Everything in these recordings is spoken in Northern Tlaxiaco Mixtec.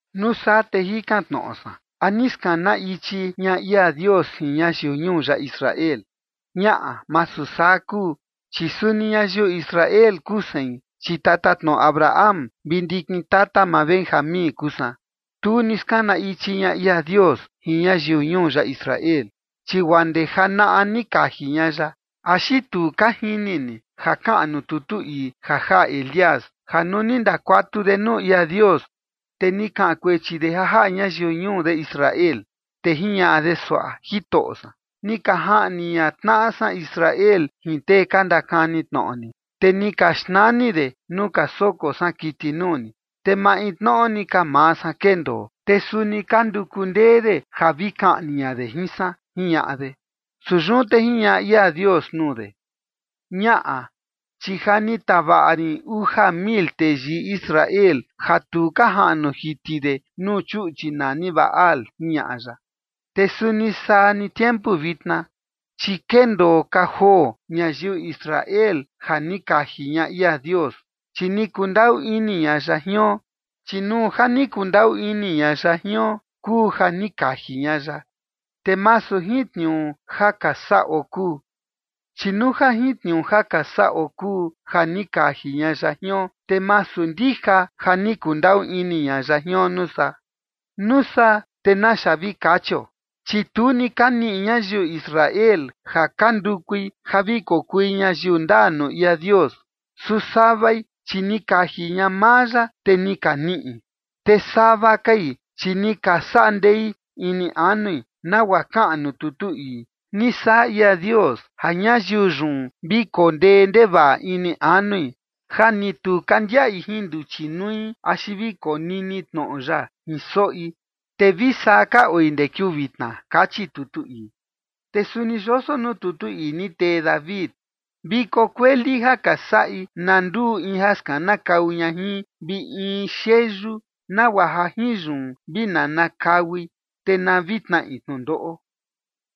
Nuu saa te jikan tnoꞌo san: ¿A ni skana ichi ña ia Dios jin ñayiu ñuu ya Israel? Ñaꞌa, masu saa kuu. Chi suni ñayiu Israel kuu sein, chi tatatnoꞌo Abraham vi ndikin tata maa Benjamín kuu san. Tu ni skana ichi ña ia Dios jin ñayiu ñuu ya Israel, chi guaa ndee janaꞌa ni kaji ña ya. ¿Axi tu ka jini ni ja kaꞌan nuu tutu ii ja jaꞌa Elías ja nuu ni ndakuatu de nuu ia Dios? Te ni kaꞌan kuechi de ja jaꞌa ñayiu ñuu de Israel, te jiñaꞌa de suaꞌa: “Jitoꞌo san, ni ka jaꞌni ña tnaꞌa san Israel jin tee ka ndakani tnoꞌo ni, te ni ka xnani de nuu ka soko san kiti nuu ni, te maintnoꞌo ni ka maa san kendoo, te suni ka nduku ndee de ja vi kaꞌni ña de jin san”, jiñaꞌa de. Su yun te jiñaꞌa ia Dios nuu de: “Ñaꞌa, chi ja ni tavaꞌa rin uja mil teyii Israel ja tu ka jaꞌnu jiti de nuu chuꞌchi nani Baal”, jiñaꞌa ya. Te suni saa ni tiempu vitna, chi kendoo ka joo ñayiu Israel ja ni kaji ña ia Dios, chi ni kundaꞌu ini ña ya jion. Chi nuu ja ni kundaꞌu ini ña ya jion kuu ja ni kaji ña ya, te masu jin tniuu ja ka saꞌo kuu. Chi nuu ja jin tniuu ja ka saꞌo kuu ja ni kaji ña ya jion, te masu ndija ja ni kundaꞌu ini ña ya jion nuu saa. Nuu saa, ¿te naxa vi kachio? Chi tu ni ka niꞌi ñayiu Israel ja ka ndukui ja vi kokui ñayiu ndaa nuu ia Dios. Su savai chi ni kaji ña maa ya, te ni ka niꞌi. Te sava kai, chi ni ka saꞌa ndei ini anui, nagua kaꞌan nuu tutu ii: “Ni saꞌa ia Dios ja ñayiu yun vi koo ndee ndevaꞌa ini anui, ja ni tu ka ndiaꞌi jin nduchi nui axi vi konini tnoꞌo ya jin soꞌi, te vi saa ka oi ndee kiuu vitna”, kachi tutu ii. Te suni yoso nuu tutu ii ni tee David: Viko kueli ja ka saꞌi na nduu in ja skanakau ña jin, vi in xeyu, nagua ja jin yun vi nanakaui, te na vi tnaꞌi tnundoꞌo.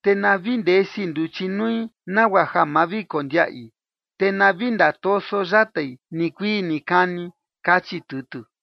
Te na vi ndesi nduchi nui nagua ja ma vi kondiaꞌi, te na vi ndatoso yatai nikuii nikani ni, kachi tutu.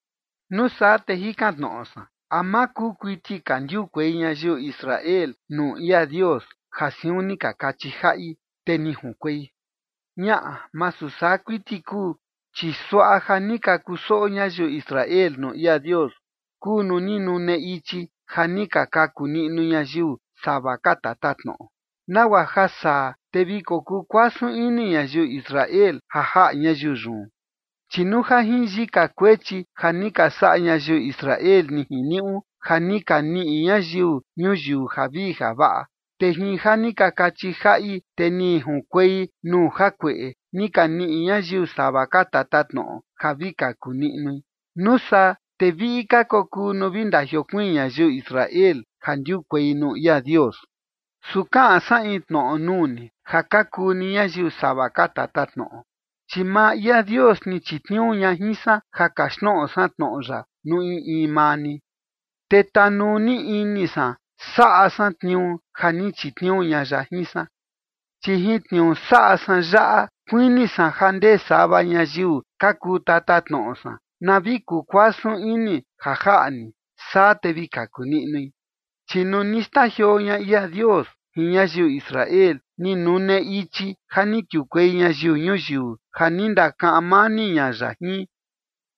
Nuu saa te jikan tnoꞌo san: ¿A ma kuu kuiti ka ndiukuei ñayiu Israel nuu ia Dios ja siun ni ka kachi jaꞌi te ni junkuei? Ñaꞌa, masu saa kuiti kuu. Chi suaꞌa ja ni ka kusoꞌo ñayiu Israel nuu ia Dios kuu nuu ni nune ichi ja ni ka kaku niꞌnu ñayiu sava ka tatatnoꞌo, nagua ja saa te vi kokuu kuasun ini ñayiu Israel ja jaꞌa ñayiu yun. Chi nuu ja jin yika kuechi ja ni ka saꞌa ñayiu Israel, ni jiniuꞌu ja ni ka niꞌi ñayiu ñuyiu javii javaꞌa, te jin ja ni ka kachi jaꞌi, te ni junkuei nuu jakueꞌe ni ka niꞌi ñayiu sava ka tatatnoꞌo ja vi kaku niꞌnui, nuu saa te viꞌi ka kokuu nuu vi ndajiokuiin ñayiu Israel ja ndiukuei nuu ia Dios. Su kaꞌan san in tnoꞌo nuu ni ja ka kuu ni ñayiu sava ka tatatnoꞌo. Chi maa ia Dios ni chitniuu ña jin san ja kaxtnoꞌo san tnoꞌo ya nuu in in maa ni, te tanuu ni ini san saꞌa san tniuu ja ni chitniuu ña ya jin san. Chi jin tniuu saꞌa san yaꞌa kuini san ja ndee sava ñayiu ka kuu tatatnoꞌo san na vi kuu kuasun ini ja jaꞌa ni, saa te vi kaku niꞌnui. Chi nuu ni xndajioo ña ia Dios jin ñayiu Israel, ni nune ichi ja ni kiukuei ñayiu ñuyiu ja ni ndakaꞌan mani ña ya jin.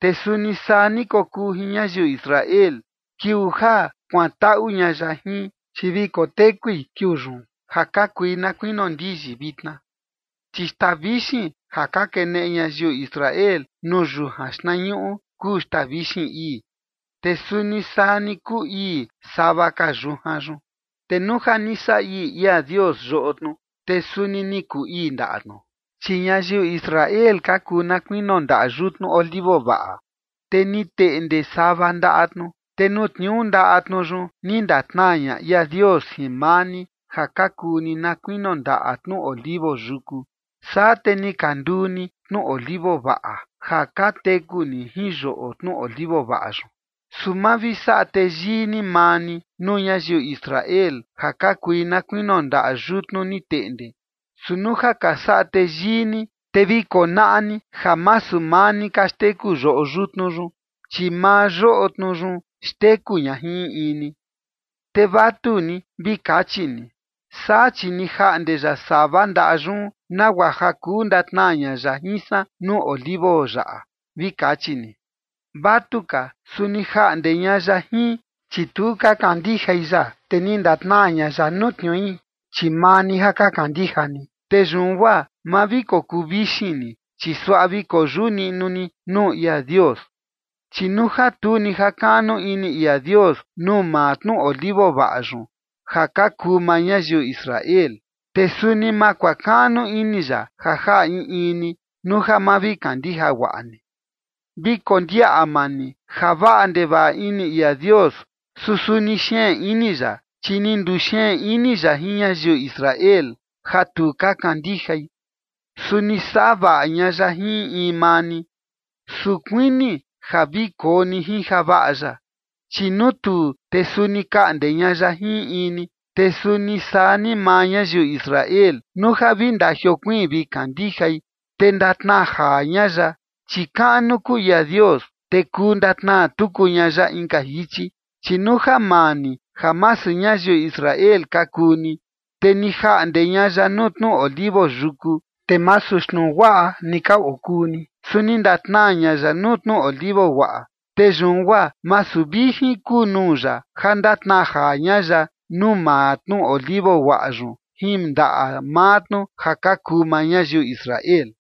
Te suni saa ni kokuu jin ñayiu Israel, kiuu ja kuantaꞌu ña ya jin, chi vi kotekui kiuu yun ja ka kui na kuinio ndiyi vitna. Chi xtaa vixin ja ka keneꞌe ñayiu Israel nuu yujan xtnañuꞌu kuu xtaa vixin ii, te suni saa ni kuu ii sava ka yujan yun. Te nuu ja ni saꞌa ii ia Dios yoꞌo tnu, te suni ni kuu ii ndaꞌa tnu. Chi ñayiu Israel ka kuu na kuinio ndaꞌa yutnu olivo vaꞌa, te ni teꞌnde sava ndaꞌa tnu. Te nuu tniuu ndaꞌa tnu yun ni ndatnaa ña ia Dios jin maa ni, ja ka kuu ni na kuinio ndaꞌa tnu olivo yuku. Saa te ni ka nduu ni tnu olivo vaꞌa, ja ka teku ni jin yoꞌo tnu olivo vaꞌa yun. Su ma vi saꞌa teyii ni maa ni nuu ñayiu Israel, ja ka kui na kuinio ndaꞌa yutnu ni teꞌnde. Su nuu ja ka saꞌa teyii ni, te vi konaꞌa ni ja masu maa ni ka xteku yoꞌo yutnu yun, chi maa yoꞌo tnu yun xteku ña jin in in ni. Te vatu ni vi kachi ni: “Saa chi ni jaꞌnde ya sava ndaꞌa yun nagua ja kuu ndatnaa ña ya jin san nuu olivo yaꞌa”, vi kachi ni. Vatuka, su ni jaꞌnde ña ya jin, chi tu ka kandijai ya, te ni ndatnaa ña ya nuu tniui, chi maa ni ja ka kandija ni. Te yun guaa ma vi kokuu vixin ni, chi suaꞌa vi koyuꞌu niꞌnu ni nuu ia Dios. Chi nuu ja tu ni jakaꞌnu ini ia Dios nuu maa tnu olivo vaꞌa yun, ja ka kuu maa ñayiu Israel, te suni ma kuakaꞌnu ini ya ja jaꞌa in in ni nuu ja ma vi kandija guaꞌa ni. Vi kondiaꞌa maa ni ja vaꞌa ndevaꞌa ini ia Dios, su suni xeen ini ya. Chi ni nduxeen ini ya jin ñayiu Israel ja tu ka kandijai, su ni saꞌa vaꞌa ña ya jin in in maa ni. Su kuini ja vi koo ni jin javaꞌa ya, chi nuu tuu, te suni kaꞌnde ña ya jin in in ni. Te suni saa ni maa ñayiu Israel, nuu ja vi ndiokuiin vi kandijai, te ndatnaa jaa ña ya, chi kaꞌnu kuu ia Dios, te kuu ndatnaa tuku ña ya inka jichi. Chi nuu ja maa ni, ja masu ñayiu Israel ka kuu ni, te ni jaꞌnde ña ya nuu tnu olivo yuku, te masu xtnu guaꞌa ni ka okuu ni, su ni ndatnaa ña ya nuu tnu olivo guaꞌa. Te yun guaa masu vijin kuu nuu ya ja ndatnaa jaa ña ya nuu maa tnu olivo guaꞌa yun jin ndaꞌa maa tnu ja ka kuu maa ñayiu Israel.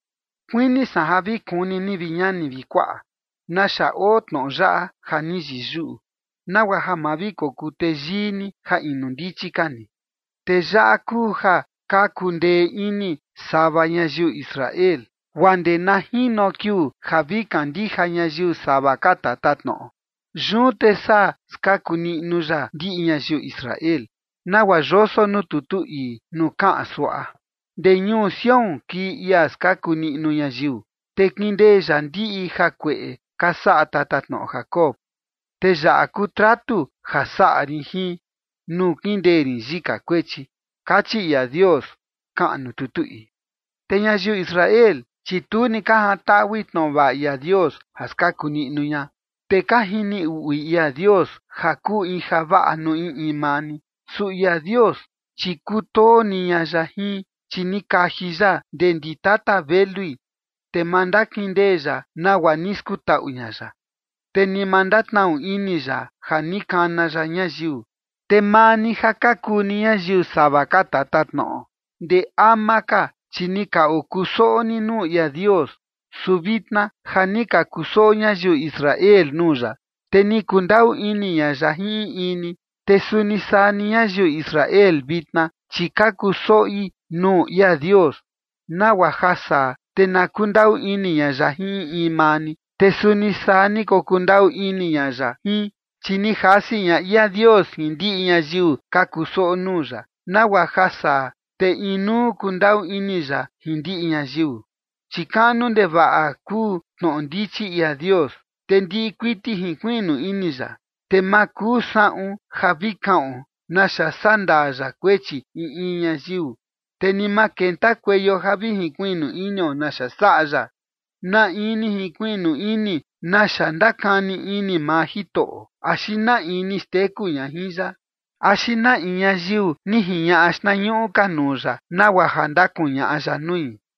Kuini san ja vi kuni ni, vi ñani vi kuaꞌa, naxa oo tnoꞌo yaꞌa ja ni yiyuꞌu, nagua ja ma vi kokuu teyii ni ja inu ndichi ka ni. Te yaꞌa kuu ja ka kundee ini sava ñayiu Israel, guaa ndee na jino kiuu ja vi kandija ñayiu sava ka tatatnoꞌo. Yun te saa skaku niꞌnu ya ndiꞌi ñayiu Israel, nagua yoso nuu tutu ii nuu kaꞌan suaꞌa: Ndee ñuu Sión kii ia skaku niꞌnu ñayiu, te kindee ya ndiꞌi jakueꞌe ka saꞌa tatatnoꞌo Jacob. “Te yaꞌa kuu tratu ja saꞌa rin jin nuu kindee rin yika kuechi”, kachi ia Dios, kaꞌan nuu tutu ii. Te ñayiu Israel, chi tu ni ka jantaꞌui tnoꞌo vaꞌa ia Dios ja skaku niꞌnu ña, te ka jini uꞌui ia Dios ja kuu in javaꞌa nuu in in maa ni. Su ia Dios, chi kutoo ni ña ya jin, chi ni kaji ya ndee ndi tata velui. Te ma ndakindee ya nagua ni skutaꞌu ña ya, te ni ma ndatnaꞌnu ini ya ja ni kana ya ñayiu. Te maa ni ja ka kuu ni ñayiu sava ka tatatnoꞌo, ndee ama ka, chi ni ka okusoꞌo ni nuu ia Dios, su vitna ja ni ka kusoꞌo ñayiu Israel nuu ya, te ni kundaꞌu ini ña ya jin in in ni. Te suni saa ni ñayiu Israel vitna, chi ka kusoꞌi nuu ia Dios, nagua ja saa, te na kundaꞌu ini ña ya jin in in maa ni, te suni saa ni kokundaꞌu ini ña ya jin. Chi ni jasi ña ia Dios jin ndiꞌi ñayiu ka kusoꞌo nuu ya, nagua ja saa te inuu kundaꞌu ini ya jin ndiꞌi ñayiu. Chi kaꞌnu ndevaꞌa kuu tnoꞌo ndichi ia Dios, te ndiꞌi kuiti jinkuiꞌnu ini ya. Te ma kuu saꞌun ja vi kaꞌon naxa sandaa ya kuechi in in ñayiu, te ni ma kentakueio ja vi jinkuiꞌnu inio naxa saꞌa ya. “¿Na in ni jinkuiꞌnu ini naxa ndakani ini maa Jitoꞌo? ¿Axi na in ni xteku ña jin ya? ¿Axi na in ñayiu ni jiñaꞌa xtnañuꞌu ka nuu ya, nagua ja ndakuñaꞌa ya nui?”